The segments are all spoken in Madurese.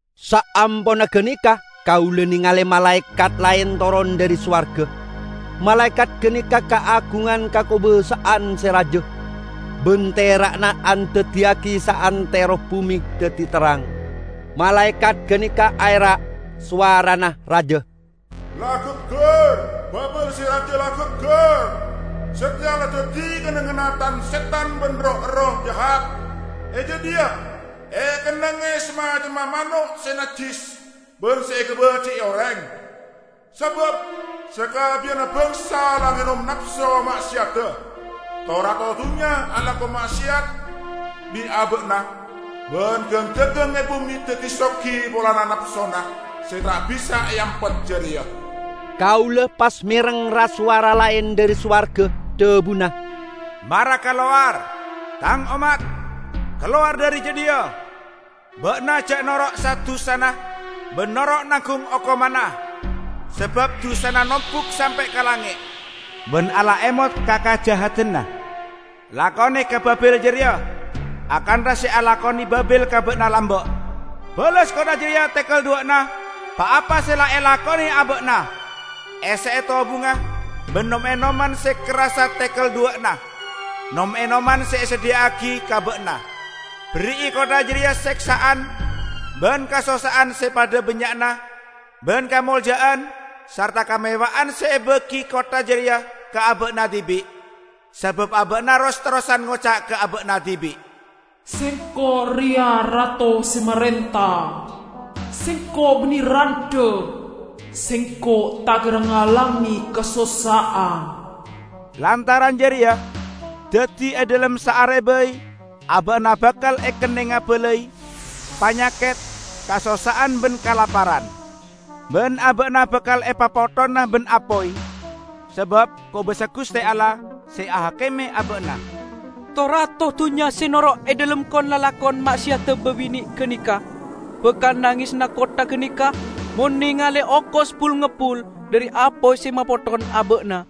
Saamponna ganeka kaula nengale malaekat laen toron dhari sowarga. Malaekat ganeka kaagungan kakobasa'an se raja, ban tera'na andaddiyagi saantero bume daddi terrang. Malaekat ganeka aera', sowarana raja, "La gaggar! Babil se raja la gaggar! Sateya la daddi kennengnganna tan-setan ban roh-erroh jahat. E jadhiya ekennengnge samacemma mano' se najjis ban se ekabaji'i oreng. Sabab sakabbiyanna bangsa la ngenom napso ma'seyadda. To-rato dunnya alako ma'seyat bi' aba'na, ban gang-dagang e bume daddi sogi polana napsona se ta' bisa eampet jareya." Kaula pas mereng ra-sowara laen dhari sowarga, dhabuna, "Mara kalowar, Tang ommat, kalowar dhari jadhiya! Ba'na ja' noro' sa-dusana, ban noro' nanggung okomanna! Sabab dusana nombuk sampe' ka langnge', ban Allah emot ka kajahadanna. Lakone ka Babil jareya akantha se elakone Babil ka ba'na lamba'; bales kottha jareya tekel dhuwa'na pa-apa se la elakone aba'na. Esse'e tobungnga ban nom-enoman se kerrassa tekel dhuwa'na nom-enoman se esadhiya'agi ka ba'na. Berri'i kottha jareya seksa'an ban kasossa'an se padha bannya'na ban kamolja'an sarta kamewahan se ebagi kottha jareya ka aba'na dibi'. Sabab aba'na ros-terrosan ngoca' ka aba'na dibi', 'Sengko' reya rato se marenta! Sengko' banne randha; sengko' ta' kera ngalame kasossa'an!' Lantaran jareya, daddi e dhalem saare bai aba'na bakal ekennenga balai -- panyaket, kasossa'an ban kalaparan. Ban aba'na bakal epapotthona ban apoy, sabab kobasa Guste Allah, se ahakime aba'na." To-rato dunnya se noro' e dhalem kon-lalakon ma'seyadda babine' ganeka bakal nangesana kottha ganeka mon nengale okos bul-ngebbul dhari apoy se mapotthon aba'na.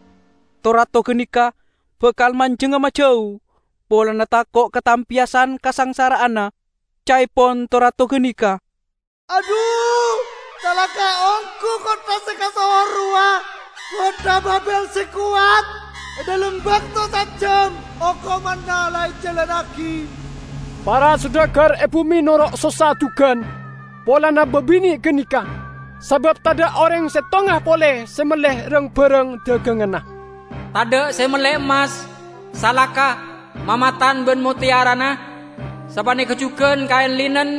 To-rato ganeka bakal manjengnga majau, polana tako' katampeyasan kasangsara'anna. Ca'epon to-rato ganeka, "Adhu, calaka' onggu kottha se kasohor rowa -- kottha Babil se kowat! E dhalem bakto saejjam okomanna la ejalannagi!" Para sodagar e bume noro' sossa jugan polana babine' ganeka, sabab tadha' oreng settonga pole se melle rang-barang daganganna. Tadha' se melle emmas, salaka, mamatan ban motteyarana; sapaneka jugan kaen linen,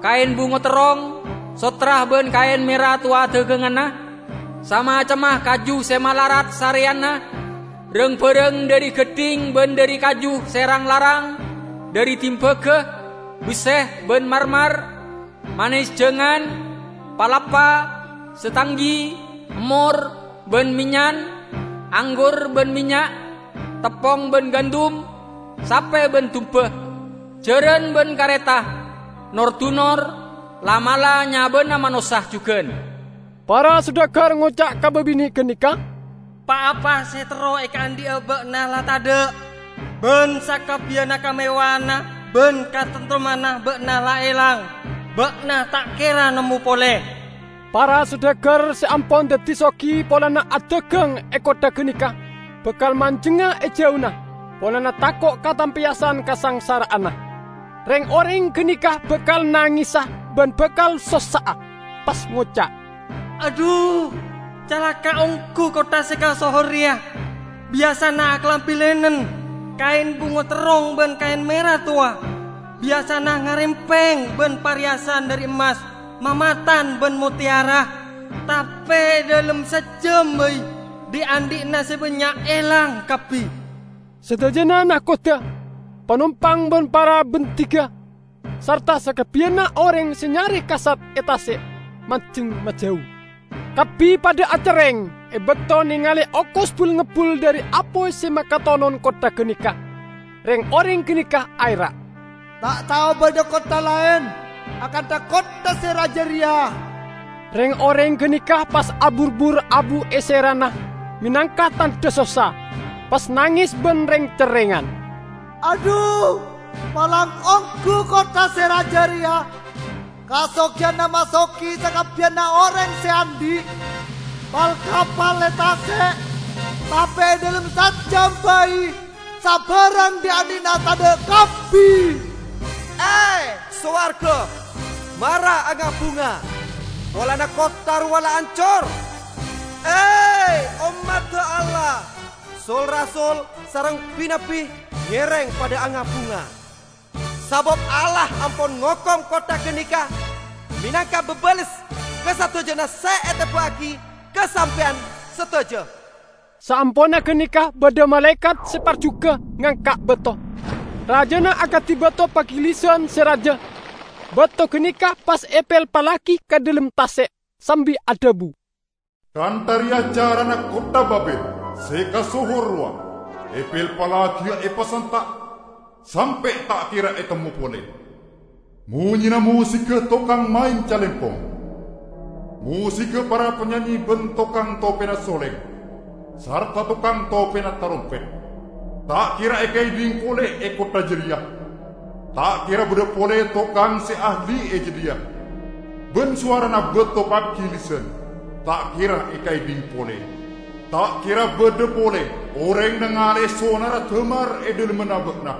kaen bungo terrong, sottra ban kaen mera towa daganganna; samacemma kaju se malarat sareyanna, rang-barang dhari gaddhing ban dhari kaju se rang-larang, dhari dimbaga, besse ban marmar; manesjangan, palappa, setanggi, emmor ban mennyan; anggur ban mennya', teppong ban gandum; sape ban dumba, jaran ban kareta, nor-dunor, la'-mala' nyabana manossa jugan. Para sodagar ngoca' ka babine' ganeka, "Pa-apa se terro ekaandhi'a ba'na la tadha', ban sakabbiyanna kamewahanna ban kataremtemmanna ba'na la elang. Ba'na ta' kera nemmo pole!" Para sodagar se ampon daddi sogi polana adagang e kottha ganeka bakal manjengnga e jauna, polana tako' katampeyasan kasangsara'anna. Reng-oreng ganeka bakal nangesa ban bakal sossa'a, pas ngoca', "Adhu, calaka' onggu kottha se kasohor reya! Biyasana akalambi linen, kaen bungo terrong ban kaen mera towa; biyasana ngarempeng ban pareyasan dhari emmas, mamatan ban motteyara! Tape e dhalem saejjam bai dhi'-andhi'na se bannya' elang kabbi!" Sadajana nakodda, panompang ban para bandhiga sarta sakabbiyanna oreng se nyare kasap e tase', manjeng majau. Kabbi padha acerreng e bakto nengale okos bul-ngebbul dhari apoy se makatonon kottha ganeka. Reng-oreng ganeka aera', "Ta' tao badha kottha laen akantha kottha se raja reya!" Reng-oreng ganeka pas aburbur abu e serana menangka tandha sossa, pas nanges ban reng-cerrengan, "Adhu, palang onggu kottha se raja reya! Kasogiyanna masogi sakabbiyanna oreng se andhi' pal-kapal e tase'! Tape e dhalem saejjam bai, sabarang dhi'-andhi'na tadha' kabbi!" E, sowarga, mara anga-bunga polana kottha rowa la ancor! E, ommadda Allah, sul-rasul sareng bi-nabbi, ngereng padha anga-bunga! Sabab Allah ampon ngokom kottha ganeka menangka babales ka sadajana se eteba'agi ka sampeyan sadaja! Saamponna ganeka badha malaekat se parjuga ngangka' bato -- rajana akadi bato pagilisan se raja -- bato ganeka pas epelpallagi ka dhalem tase', sambi adhabu, "Kantha reya carana kottha Babil se kasohor rowa epelpallagiya epasanta' sampe' ta' kera etemmo pole. Monyena mosigga tokang maen calempong, mosigga para panyanyi ban tokang topena soleng sarta tokang topena tarompet, ta' kera ekaedhing pole e kottha jareya! Ta' kera badha pole tokang se ahli e jadhiya, ban sowarana bato pagilisan ta' kera ekaedhing pole. Ta' kera badha pole oreng nangale'e sonarra damar e dhalemmanna ba'na;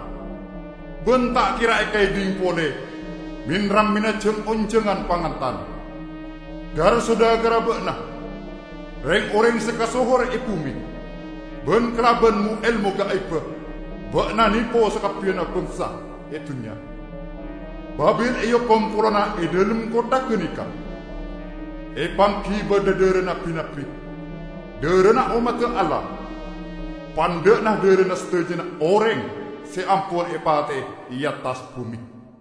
ban ta' kera ekaedhing pole men-rammenna jang-onjangan pangantan. Gar-sodagarra ba'na reng-oreng se kasohor e bume, ban kalaban mo-elmo gaibba ba'na nepo sakabbiyanna bangsa e dunnya!" Babil eokom polana e dhalem kottha ganeka epanggi badha dharana bi-nabbi, dharana ommadda Allah -- pandha'na dharana sadajana oreng se ampon epate'e e attas bume.